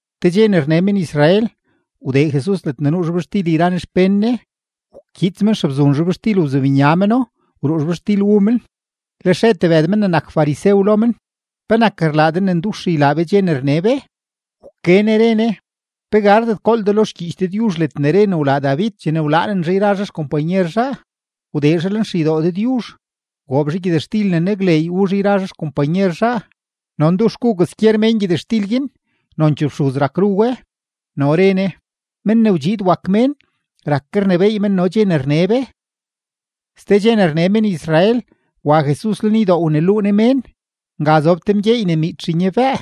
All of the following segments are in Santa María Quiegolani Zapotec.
Te dxe ne rne men-Israel, wdee Jesus ledne nuu zhobxtil yra Ne xpén Ne; wkyiits men xebzun zhobxtil wzibnya meno, wruu zhobxtil wu men. Lex re tebëd men ne nak farisew lo men: ―¿Penak rlaa de ne ndux ylaa be dxe ne rne be? Wke Ne re Ne: ―¿Pe gardet gool de lo xgyiich Dëdyuzh ledne re ne wlaa David chene wlaanen zhaa yra zhaa xkompanyer zhaa? Wdee zhaa lenxeydoo Dëdyuzh, wgoob zhaa gyëtxtil ne nakleey wu zhaa yra zhaa xkompanyer zhaa, no ndux gu kwaskyer mén gyëtxtil guin, nonchee fxuz rak ru we. No re Ne: ―Men ne wdxiid wak Mén rak ke rnebééy men no dxe ne rne be. Ste dxe ne rne men-Israel, wa Jesus lenydoo wneluu Ne mén. Nga zob te mgyeey ne miitx nyabëë.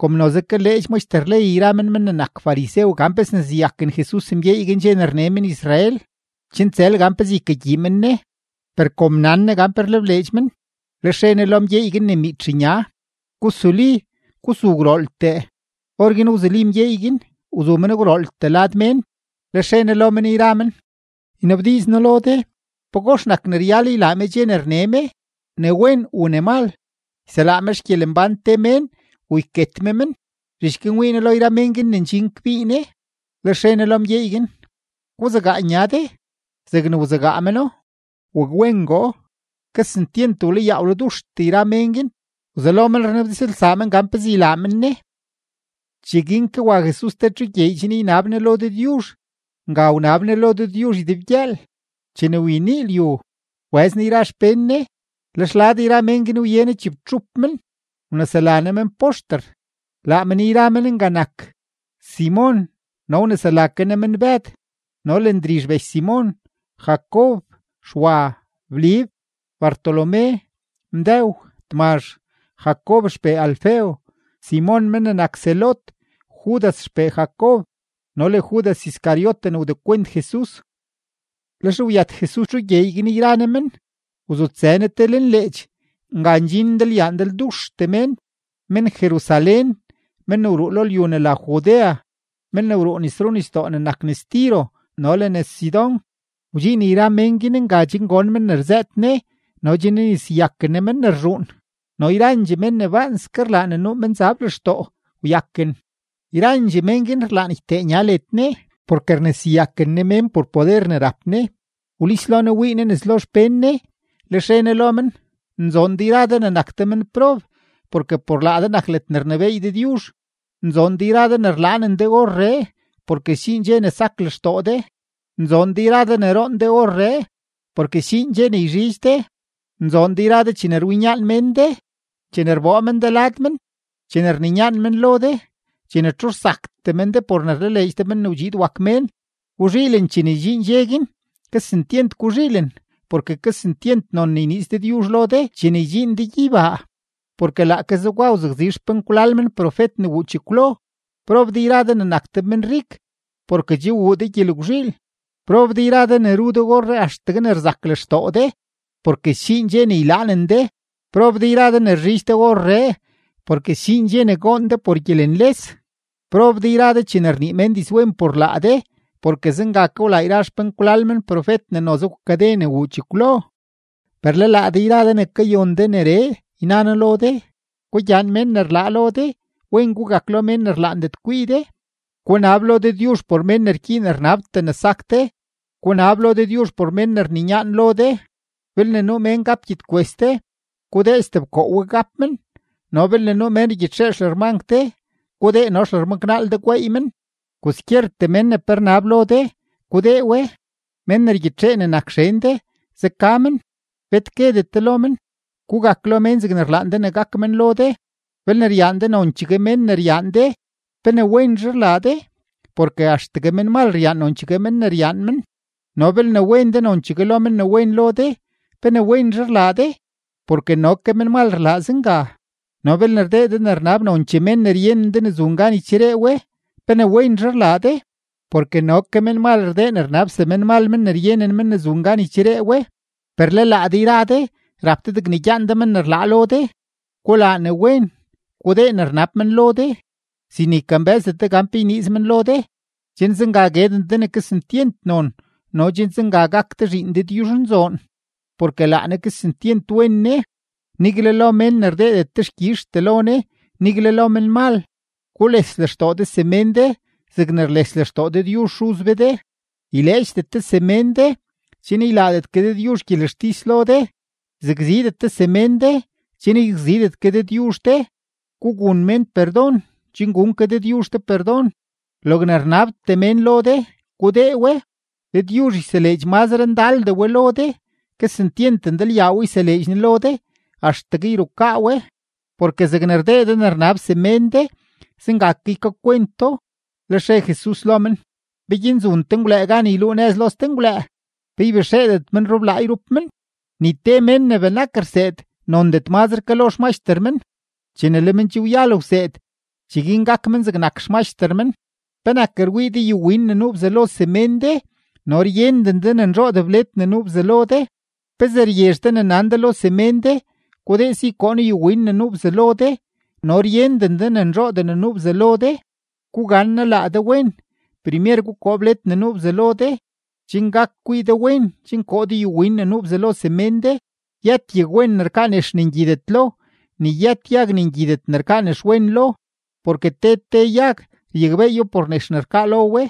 Kom noze kaleedx maxter ley yra men men ne nak farisew gan pe sneseyaken Jesus mgyeey guin dxe ne rne men-Israel, chen tsël gan pezee ykagyii men Ne. Per kom nan Ne gan pe rlebleedx men, lex re Ne lo mgyeey guin ne miitx nya: ―Gusuli, gusu gwrooltee. Orguin wzuli mgyeey guin, wzu men gwrooltee lad mén. Lex re Ne lo men yra men: ―Ynabdiiz noo lo de: ¿Pagox nak ne ryal ylaa me dxe ne rne me, ne wen u ne mal?, ¿yselaa me xgyelembán te mén u yket me men? Zhich guin wii Ne lo yra mén guin ne ndxin kbii Ne, lex re Ne lo mgyeey guin: ―Guzegaa nya de. Zegne wzegaa meno, wakwengoo. Kesentyent wlayaa wladuxtee yra mén guin. Wzelo men rnabdizlsaa men gan pezee ylaa men Ne. Cheguin ke wa Jesus te txu gyeey chen ynab Ne lo Dëdyuzh; nga wnab Ne lo Dëdyuzh ydebgyëël. Chene wyenii lyu, wbëz Ne yra xpén Ne, lex lad yra mén guin wye Ne chibtxup men, wnesela Ne men poxter. Laa men yra men nga nak: Simon no wnesela ke Ne men Bëd, no le Ndrizh bech Simon, Jacob, Xwa, Blib, Bartolomé, Mdëw, Tmazh, Jacob xpee Alfeo, Simon men ne nak Zelot, Judas xpee Jacob, no le Judas Iscariote ne wdekwent Jesus. Lex wyët Jesus txu gyeey guin yra Ne men, wzutsë Ne te lenleech. Nga ndxin ndalyaa ndalduxtee mén: men-Jerusalén, men ne wruu lo lyu ne la Judea, men ne wruu nes runisdoo ne nak nes Tiro no le nes Sidón. Wdxiin yra mén guin nga chen gon men ne rzëët Ne no chen yneseyaken Ne men ne rzhuun. No yrandxee men ne baanske rlaa ne nuu menzab lextoo wyaken. Yrandxee mén guin rlaan ytee nya led Ne porke rneseyaken Ne mén por poder ne rap Ne. Wlis lo Jesus wii Ne nes lo xpén Ne, lex re Ne lo men: ―Nzoon de yra de ne nak de menprob, porke por laa de nak ledne rnebééy Dëdyuzh. ’Nzoon de yra de ne rlaanen de orree, porke sdxiin dxe ne sak lextoo de. ’Nzoon de yra de ne roon de orree, porke sdxiin dxe ne yzhidx de. ’Nzoon de yra de chene rwinyaan mén de, chene rboo men de lad men, chene rninyaan men lo de, chene txu rsaktee men de por ne rlaleedx de Men ne wdxiid wak Mén. Guzhiilen chene ydxiin dxe guin, kesentyent guzhiilen, porke kesentyent non ne yniiz Dëdyuzh lo de chene ydxiin de gyeybaa, porke laake zegwa wzakzi yra xpenkwlal men profet ne wuu chekwlo. ’Prob de yra de ne nak de menrik, porke che wuu de gyelgwzhiil. ’Prob de yra de ne ru de orree axtegue ne rzak lextoo de, porke sdxiin dxe ne ylaanen de. ’Prob de yra de ne rzhidx de orree, porke sdxiin dxe ne goon de por gyelenles. ’Prob de yra de chene rnii mén dizwen por laa de, porke zenga ke wlaa yra xpenkwlal men profet ne noze wkade ne wuu chekwlo. ’Per le laa de yra de ne kayon de neree, yna noo lo de: Gugyaan mén ne rlaa lo de, wen gugak lo mén ne rlaandet kwii de, gunab lo Dëdyuzh por mén ne rgyiin rnabtee ne sak de, gunab lo Dëdyuzh por men ne rninyaan lo de. Belne nuu mén gap gyedkwes de, gudee stebkoo we gap men, no belne nuu mén rgyitxee xlërmank de, gudee no xlërmanknaal de gweey men. Kwaskyertee mén ne pe rnab lo de, gudee we; men ne rgyitxee ne nak xen de, zeka men, bet guedet de lo men. Gugak lo mén zegne rlaan de ne gak men lo de. ’Belne ryaan de nonchegue mén ne ryaan de, ¿pe ne wenzhe rlaa de? Porke axtegue menmal ryaan nonchegue mén ne ryaan men. No belne wen de nonchegue lo men ne wen lo de, ¿pe ne wenzhe rlaa de? Porke no ke menmal rlaa zenga. No belne rdee de ne rnab nonchee mén ne ryenen de ne zun gan ycheree we, ¿pe ne wenzhe rlaa de? Porke no ke menmal rdee ne rnab semenmal men ne ryenen men ne zun gan ycheree we. Per le laa de yra de, rap de degne gyaan de men ne rlaa lo de, gulaa ne wen, gudee ne rnab men lo de sin ne ykambë́zdet de gan pe yniiz men lo de, chen zenga gueden de ne kesentyent non no chen zenga gak de zhiin Dëdyuzhnzoon; porke laa Ne kesentyent wen Ne, nigle lo mén ne rdeedet dexkyizhtee lo Ne, nigle lo menmal. Gules lextoo de semén de zegne rles lextoo Dëdyuzh Xuz be de. ’Yleedxdet de semén de, chen ylaadet ke Dëdyuzh gyelextis lo de. Yzakzidet de semén de, chen yzakzidet ke Dëdyuzh de. Gugun mén perdon, chen gun ke Dëdyuzh de perdon. Logne rnabtee mén lo de, gudee we, Dëdyuzh yseleedx mazre ndaldee we lo de; kesentyent ndalyaadee we yseleedx Ne lo de axtegue yrukaa we. Porke zegne rdee de ne rnab semén de, zenga ke ykakwent do. Lex re Jesus lo men: ―¿Peguin zun te ngwlëë gan yluu nëz lo ste ngwlëë? ¿Pe ybexeedet men rublaa yrup men? Ni te mén ne benak rseed nondet mazre ke lo xmaxter men. Chene le men che wyal wseed, cheguin gak men zegnak xmaxter men. ’¿Penak rwii de yuwin ne nuu bzalo semén de no ryenden de ne nzhoodee bled ne nuu bzalo de? ¿Pezee ryezh de ne nan de lo semén de: “Gudee si koo noo yuwin ne nuu bzalo de”, no ryenden de ne nzhoodee ne nuu bzalo de? ¡Gugannaa laa de wen! Primer gukoo bled ne nuu bzalo de, chen gak kwii de wen chen koo de yuwin ne nuu bzalo semén de. ’Yët yagwen ne rkaa nex ne ngyidet lo, ni yët yag ne ngyidet ne rkaa nexwen lo. Porke te te yag ryakbeeyo por nex ne rkaa lo we: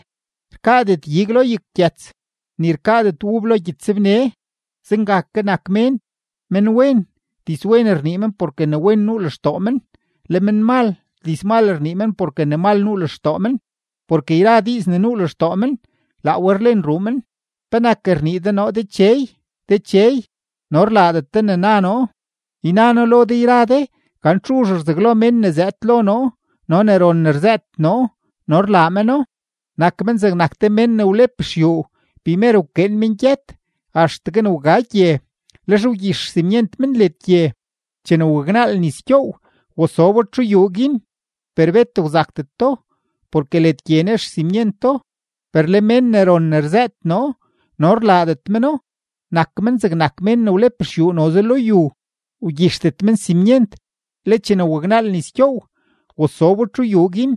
rkaadet ig lo yaggyëts, ni rkaadet ub lo gyëtsbne. Zenga ke nak mén: menwen, dizwen rnii men porke ne wen nuu lextoo men; le menmal, dizmal rnii men porke ne mal nuu lextoo men. Porke yra diiz ne nuu lextoo men, laa we rlen ruu men. ’¿Penak rnii de noo, “Dechey, Dechey”, no rlaadet de ne na noo? Yna noo lo de yra de, gan txuzh rzaglo mén ne zëëd lo noo no ne ron ne rzëët noo no rlaa meno: nak men zegnak te mén ne wlep xyuu, primer wkeen men gyët axtegue ne wga gye, lex wgyix xsimyent men led gye. Chene waknaal nis gyoow, wasobo txu yuu guin, per bet wzakdeto porke led gye nex xsimyento. Per le mén ne ron ne rzëët noo no rlaadet meno, nak men zegnak mén ne wlep xyuu noze lo yu, wgyixdet men simyent. Le chene waknaal nis gyoow, wasobo txu yuu guin,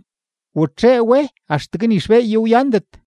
watxee we axtegue ni xbeeyo wyandet.